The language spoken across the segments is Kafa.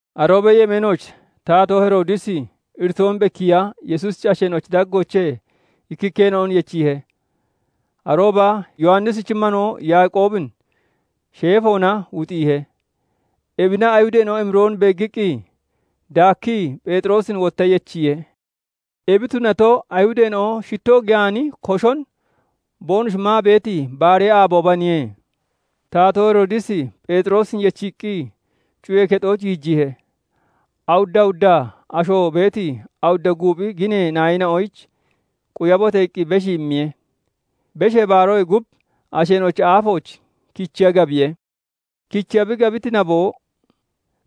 Aroobee yemeenooch Taatoo Heroodisi iritoon bekkiiya Yesuusichi asheena'ochi daggoochee ikkikkeena'on yechiihe. Arooba Yowannishichi manoo Yaaqoobin sheefoona wuxiihe. Ebina Ayihudeena'o emiroon beeggiqqi, daakkii Pheexiroosin wotta yechiihe. Ebi tunato, Ayihudeena'o shittoo giyaani koshon boonoshi maa beeti baaree aaboobaniye. Taatoo Heroodisi Pheexiroosin yechiiqqi, cuyee kexooch giijiihe. Awudda awudda asho beeti awudda guuphi ginee naayina'oyich "Quyabote!" iqqi beshii immiye. Beshee Baaroyee gub asheena'ochi aafooch kichiya gabiye. Kichiya bi gabiti naboo,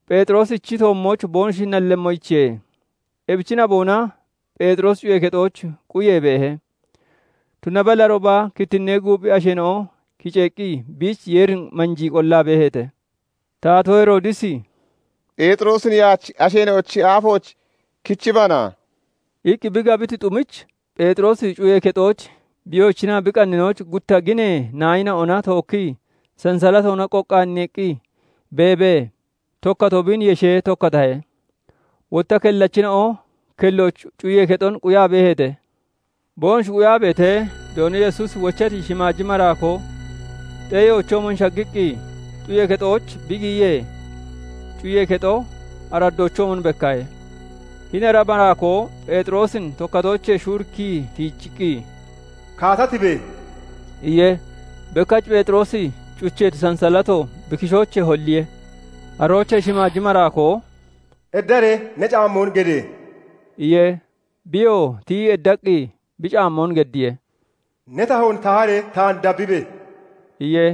Pheexiroosichi toommooch boonoshi nallemmoyichiye. Ebichi naboona Pheexiroosi cuyee kexooch quyee beehe. Tunaballi arooba kittinnee guuphi asheena'o kiceeqqi biich Yeerin manjii qollaa beeheete. Taatoo Heroodisi "Pheexiroosin yaach asheena'ochi aafooch kichibana!" iqqi bi gabiti xumich, Pheexiroosi cuyee kexooch bi yoochinaa bi qanninooch gutta ginee naayina'ona tookkii sansalatoona qoqqaaneeqqi beebee, tokkatoo biin yeshee tokkatahe. Wotta kellachina'o kellooch cuyee kexon quyaa beeheete. Boonoshi quyaa beetee, Doono Yesuusi wochati shimaaji maraakoo xeeyoochoomon shaggiqqi, cuyee kexooch bi giyiyee, cuyee kexo araddoochoomon bekkahe. Hini ara maraakoo Pheexiroosin tokkatoochee shuurikkii tiijiqqi, "Kaata tibe!" iye. Bekkach Pheexiroosi cucheeti sansalato bi kishoochee holliye. Aroochee shimaaji maraakoo "Eddaree ne caammoon gede!" iye. Biyoo tiyii eddaqqi bi caammoon geddiye. "Ne tahoon taharee, taan dabbibe!" iye.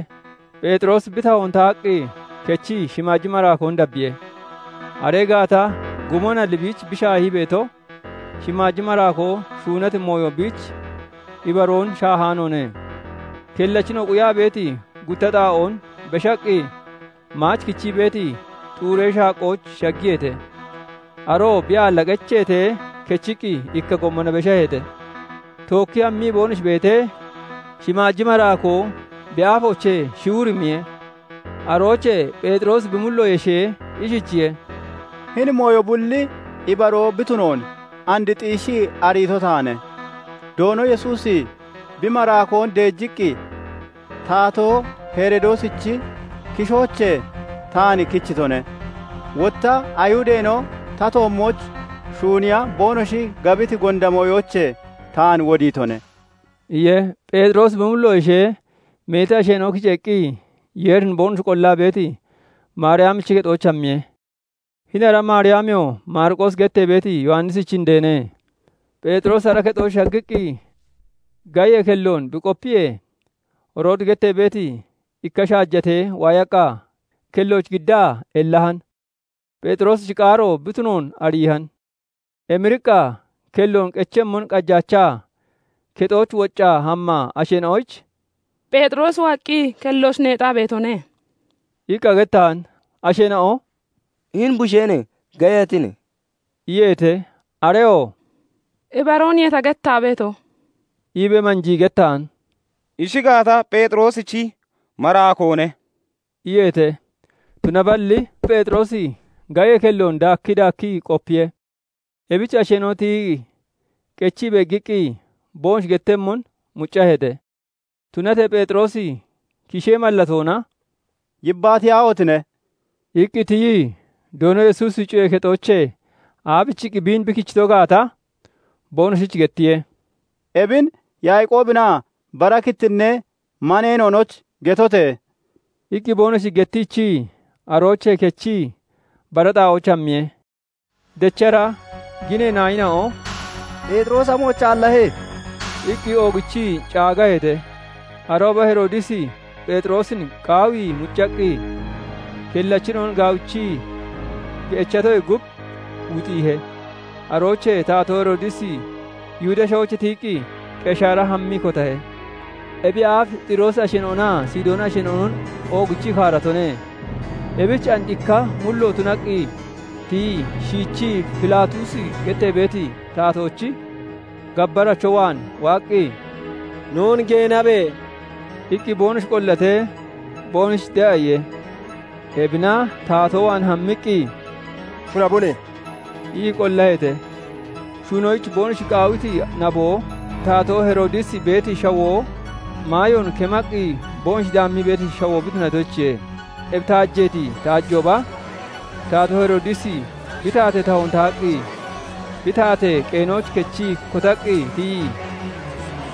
Pheexiroosi bi tahoon tahaqqi kechii shimaaji maraakoon dabbiye. Aree gaata gumonalli biich bi shaahii beeto, shimaaji maraakoo shuunati mooyo biich ibaroon shaahaanoone. Kellachina'o quyaa beeti gutta xaa'oon beshaqqi, maach kichii beeti xuuree shaaqqooch shaggiyeete. Aroo bi aalla qecheetee, kechiqqi ikka gommona beshaheete. Tookkii hammii boonoshi beetee, shimaaji maraakoo bi aafoochee shiwirimiye. Aroochee Pheexiroosi bi mullo yeshee ishichiye:- "Hini mooyo bulli ibaroo bi tunoon and xiishii ariito taane. Doono Yesuusi bi maraakoon deejiqqi, Taatoo Heroodisichi kishoochee taan kichitone; wotta Ayihudeena'o ta toommooch shuuniya boonoshi gabiti gonda mooyoochee taan wodiitone" iye. Pheexiroosi bi mullo yeshee, meeti asheena'o kiceeqqi, Yeerin boonoshi qollaa beeti, Maariyamichi kexooch hammiye; hini ara Maariyamiyoo Maariqoosi gettee beeti Yowannisichi indeene. Pheexiroosi ara kexooch shaggiqqi gayee kelloon bi qopiyee, Roodi gettee beeti ikka shaajatee waayaqqa kellooch giddaa ellahan; Pheexiroosichi qaaro bi tunoon ariihan. Emiriqqa kelloon qechemmon qajaachaa, kexooch woccaa hammaa asheena'oyich "Pheexiroosi waaqqi kellooch neexaa beetone" iqqa gettahan. Asheena'o "Hini busheene! Geyatine!" iyeete. Areyoo "Ibarooniye ta gettaa beeto" iibee manjii gettahan. "Ishi gaata, Pheexiroosichi maraakoone" iyeete. Tunaballi Pheexiroosi gayee kelloon daakkii daakkii qopiye. Ebich asheena'o tiyii qechii beeggiqqi, boonoshi gettemmon muccaheete. Tunatee Pheexiroosi kishee mallatoona "Yibbaatiyaahotine!" iqqi tiyii, Doono Yesuusi cuyee kexoochee aabichiqqi biin bi kichito gaata boonoshich gettiye. "Ebin Yaaqoobinaa bara kittinnee maneena'onoyich getote!" iqqi boonoshich gettiichii, aroochee kechii bara xaa'ooch hammiye. Dechara ginee naayina'o "Pheexiroosi amooch aallahe?" iqqi oogichii caagaheete. Arooba Heroodisi Pheexiroosin qaawii muccaqqi, kellachina'on gaawichii bi echiitoyee gub, wuxiihe. Aroochee Taatoo Heroodisi Yihudee Shawoochee tiyiqqi, Qeshaara hammii kotahe. Ebiyee aaf Xiroosi asheena'onaa Sidooni asheena'onon oogichii kaaratone. Ebich and ikka mullo tunaqqi tiyii, shiichii Filaatuusi gettee beeti taatoochi gabbaracho waan waaqqi, "Noon geenabe!" iqqi boonoshi qollatee, boonoshich de'a iye. Ebina taatoo waan hammiqqi, "Shunabone!" ii qollaheete. Shunoyich boonoshi qaawiti naboo, Taatoo Heroodisi beeti shawoo maayoon kemaqqi boonoshi daammii beeti shawoo bi tunatoyichiye. Ebi taajeeti taajooba, Taatoo Heroodisi bi taatee tahoon tahaqqi, bi taatee qeenooch kechii kotaqqi tiyii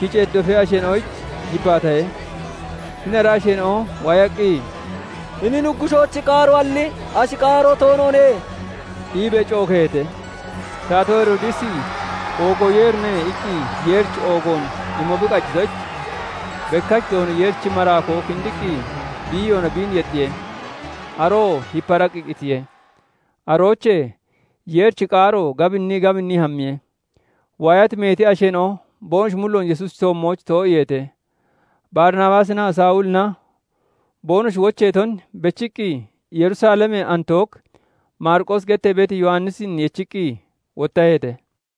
kiceeti dofee asheena'oyich yibbaatahe. Hini ara asheena'o waayaqqi, "Hini nuggushoochi qaaroalli ashi qaaro toonoone!" iibee cookeeheete. Taatoo Heroodisi "Oogo Yeerine" iqqi Yeerich oogoon imo bi qajitoyich, bekkach Doono Yeerichi maraakoo kindiqqi, biiyoona biin yexxiye; aroo hiparaqqi qitiye. Aroochee Yeerichi qaaro gabinnii gabinnii hammiye; waayati meeti asheena'o boonoshi mulloon Yesuusichi toommooch too'iiheete. Barinabaasinaa Sawulina boonoshi wocheeton bechiqqi, Yerusalemee Antook Maariqoosi gettee beeti Yowannisin yechiqqi wottaheete.